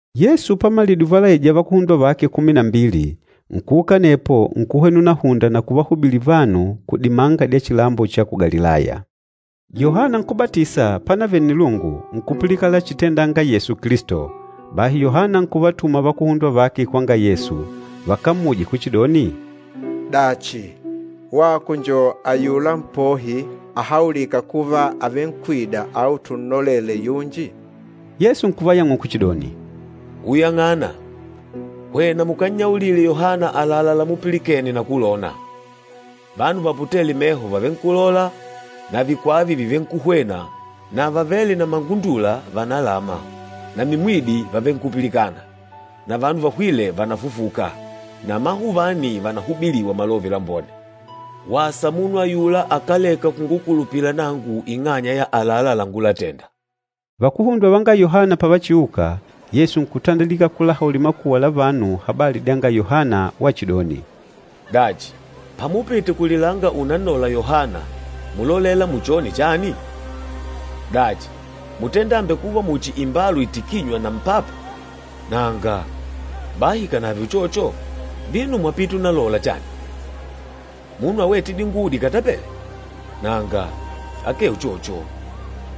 Yesu pamalidile uvalaija vakuhundwa vake kumi na mbili, nkuuka anepo nkuhwena unahunda na kuvahubilila vanu kudimanga dya chilambo cha ku Galilaya. Yohana Nkúbatisa pánavele nnilungu, nkupilikana lachitendanga Yesu Kilisto, bahi Yohana nkuvatuma vakuhundwa vake kwanga Yesu, vakammuje kuchidoni, “Dachi, wako njo ayula Mpohi ahaulîka kuva àvenkwida au tunnolele yunji?” Yesu nkuvayang'ula kuchidoni, “Uyang'ana, hwena mukannyaulile Yohana àlalá lamupilikene na kulona, vanu vaputêle meho vàvenkulola na vikwava vàvenkuhwena na vavêle na mangundula vànalama na mimwidi vàvenkupilikana na vanu vahwîle vànafufuka na amahuvani vànahubiliwa Malove Lambone. Wasa munu ayula akáleka kungukulupila nangu ing'anya ya àlalá langulatenda.” Vakuhundwa vanga Yohana pavachiuka, Yesu nkutandilika kulahaulila makuwa la vanu habali dyanga Yohana wachidoni, “Dachi, pamupite kulilanga unannola Yohana, múlolela muchone chani? Dachi, mútenda àmbekuva muchi imbalu itikînywa na mpapa? Nanga! Bahi ikànave uchocho, vino mwapite unalola chani? Munu awête dinguwo dikatapele? Nanga, akee uchocho!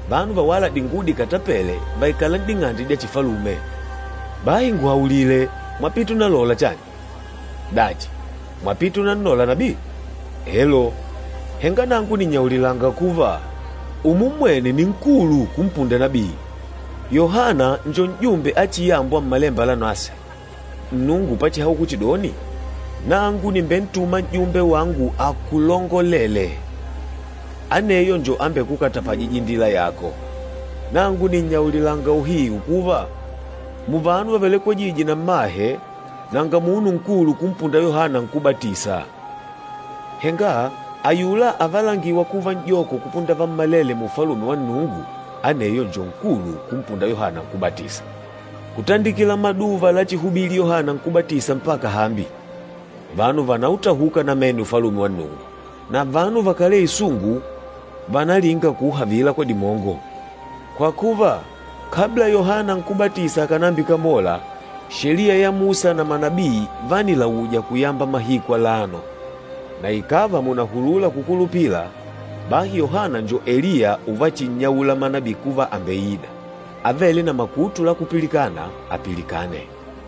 Vanu vawâla dinguwo dikatapele vaikâla n'ding'ande dya chifalume. Bahi nguhaulile, mwapite unalola chani? Dachi, mwapite unannola nabii? Elo! Henga nangu nìnnyaulilanga kuva, umummwene ni nkulu kumpunda nabii. Yohana njo n'jumbe achiyambwa Mmalemba Lanaswe, Nnungu pachihaula kuchidoni, ‘Nangu nìmbentuma n'jumbe wangu akulongolelee, aneyo njo ambekukatapajîja indila yako.’ Nangu nìnnyaulilanga uhiu kuva, muvanu vavelekwejîje na mmahe, nanga munu nkulu kumpunda Yohana Nkúbatisa. Henga ayula avalangîwa kuva n'joko kupunda vammalele mu Ufalume wa Nnungu, aneyo njo nkulu kumpunda Yohana Nkúbatisa. Kutandikila maduva lachihubili Yohana Nkúbatisa mpaka hambi, vanu vànautahuka namene Ufalume wa Nnungu, na vanu vakálee isungu vànalinga kuuhavila kwa dimongo. Kwa kuva, kabla Yohana Nkúbatisa akànambikamola, Sheliya ya Musa na manabii vánilauja kuyamba mahiku alano. Na ikàva mùnahulula kukulupila, bahi Yohana njo Eliya uvachinnyaula manabii kuva àmbeida. Avêle na makutu la kupilikana, apilikane!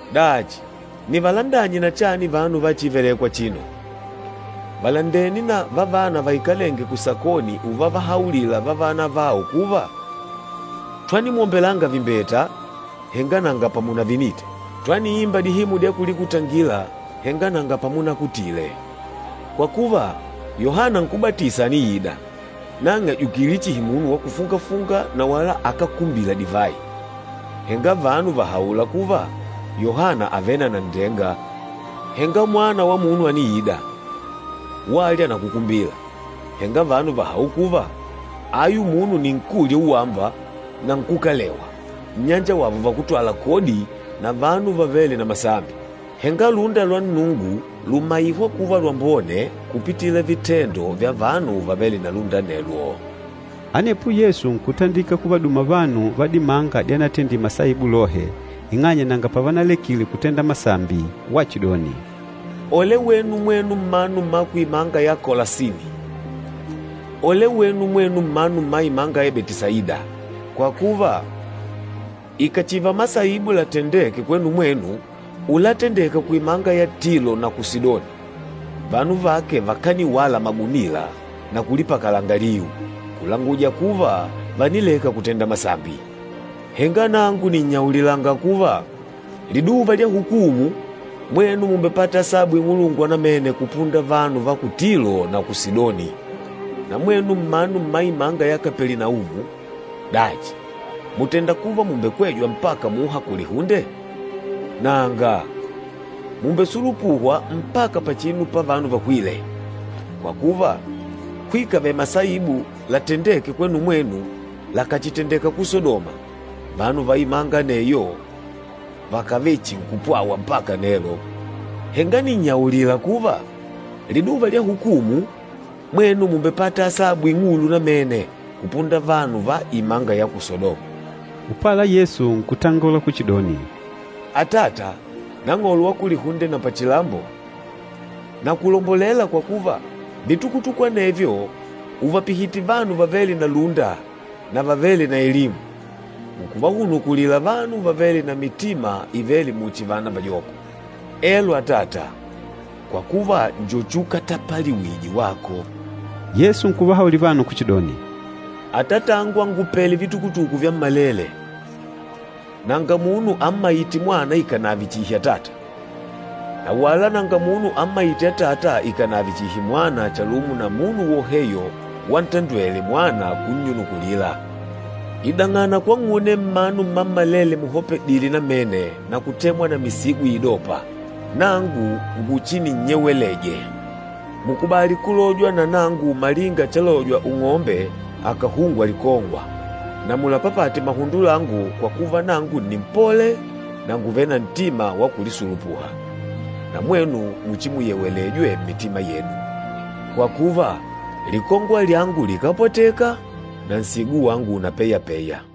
Dachi, nivalandanye na chani vanu va chívelèkwà achino? Vàlandene na vavana vaikalênge kusakoni uvavahaulila vavana avao kuva, ‘Twanimwombelanga vimbeta, henga nanga pamunavinite! Twaniimba dihimu dya kulikutangila, henga nanga pamunakutile!’ Kwa kuva, Yohana Nkúbatisa àniida, nang'e àjukile chihi munu wa kufunga-funga na wala akákumbila divayi, henga vanu vàhaula kuva, ‘Yohana àvele na nanndenga.’ Henga Mwana wa Munu àniida, walya na kukumbila, henga vanu vàhaula kuva, ‘Ayu munu nni nkúlya uwamba na nkúkalewa, nnyanjawavo vakútwala kodi na vanu vavêle na masambi!’ Henga lúnda lwa Nnungu lùmaihwa kuva lwambone kupitila vitendo vya vanu vavêle na lúnda anelwo.” Anepo Yesu nkutandilika kuvaduma vanu va dimanga dyanatendile masaibu lohe, ing'anya nanga pavanalekile kutenda masambi wachidoni, “Ole wenu mwenu mmanu mma kuimanga ya Kolasini! Ole wenu mwenu mmanu mma imanga ya Betisaida! Kwa kuva, ikàchiva masaibu latendêke kwenu mwenu, ulatendeka kuimanga ya Tilo na ku Sidoni, vanu vake vakaniwala magunila na kulipakalanga liu, kulanguja kuva vànileka kutenda masambi. Henga nangu nìnnyaulila kuva, liduva lya hukumu, mwenu mùmbepata asabu ing'ulu namene kupunda vanu va ku Tilo na ku Sidoni. Na mwenu mmanu mma imanga ya Kapelinaumu, dachi mùtenda kuva mùmbekwejwa mpaka muha kulihunde? Nanga, mùmbesulupuhwa mpaka pachinu pavanu vahwîle! Kwa kuva, kuikave masaibu latendêke kwenu mwenu, lakàchitendeka ku Sadoma, vanu va imanga aneyo vakàvechinkupwawa mpaka nelo. Henga nìnnyaulila kuva, liduva lya hukumu, mwenu mùmbepata asabu ing'ulu namene kupunda vanu va imanga ya ku Sadoma.” Upala Yesu nkutangola kuchidoni, “Atata, Nang'olo wa kulihunde na pachilambo, nakulombolela kwa kuva, vitukutuku anevyo ùvapihite vanu vavêle na lúnda na vavêle na elimu, nkuvahunukulila vanu vavêle na mitima ivêle muchi vana vajoko. Elo Atata, kwa kuva njo chukatapaliwije wako.” Yesu nkuvahaulila vanu kuchidoni, “Atatangu àngupele vitukutuku vyammalele. Nanga munu ammaîte Mwana ikànave chihi Atata, na wala nanga munu ammaîte Atata ikànave chihi Mwana chalumo na munu woheyo wantandwele Mwana kunnyunukulila. Idang'ana kwang'une mmanu mmammalele muhopedile namene na kutemwa na misigo iidopa, nangu nguchinimpumulije. Mukubali kulojwa na nangu malinga chalojwa ung'ombe akàhungwa likongwa, na mulapapate mahundo langu kwa kuva nangu nni mpole na ngùvele na ntima wa kulisulupuha, na mwenu muchimupumulijwe mmitima yenu. Kwa kuva, likongwa lyangu likápwateka, na nsigo wangu unapeyapeya.”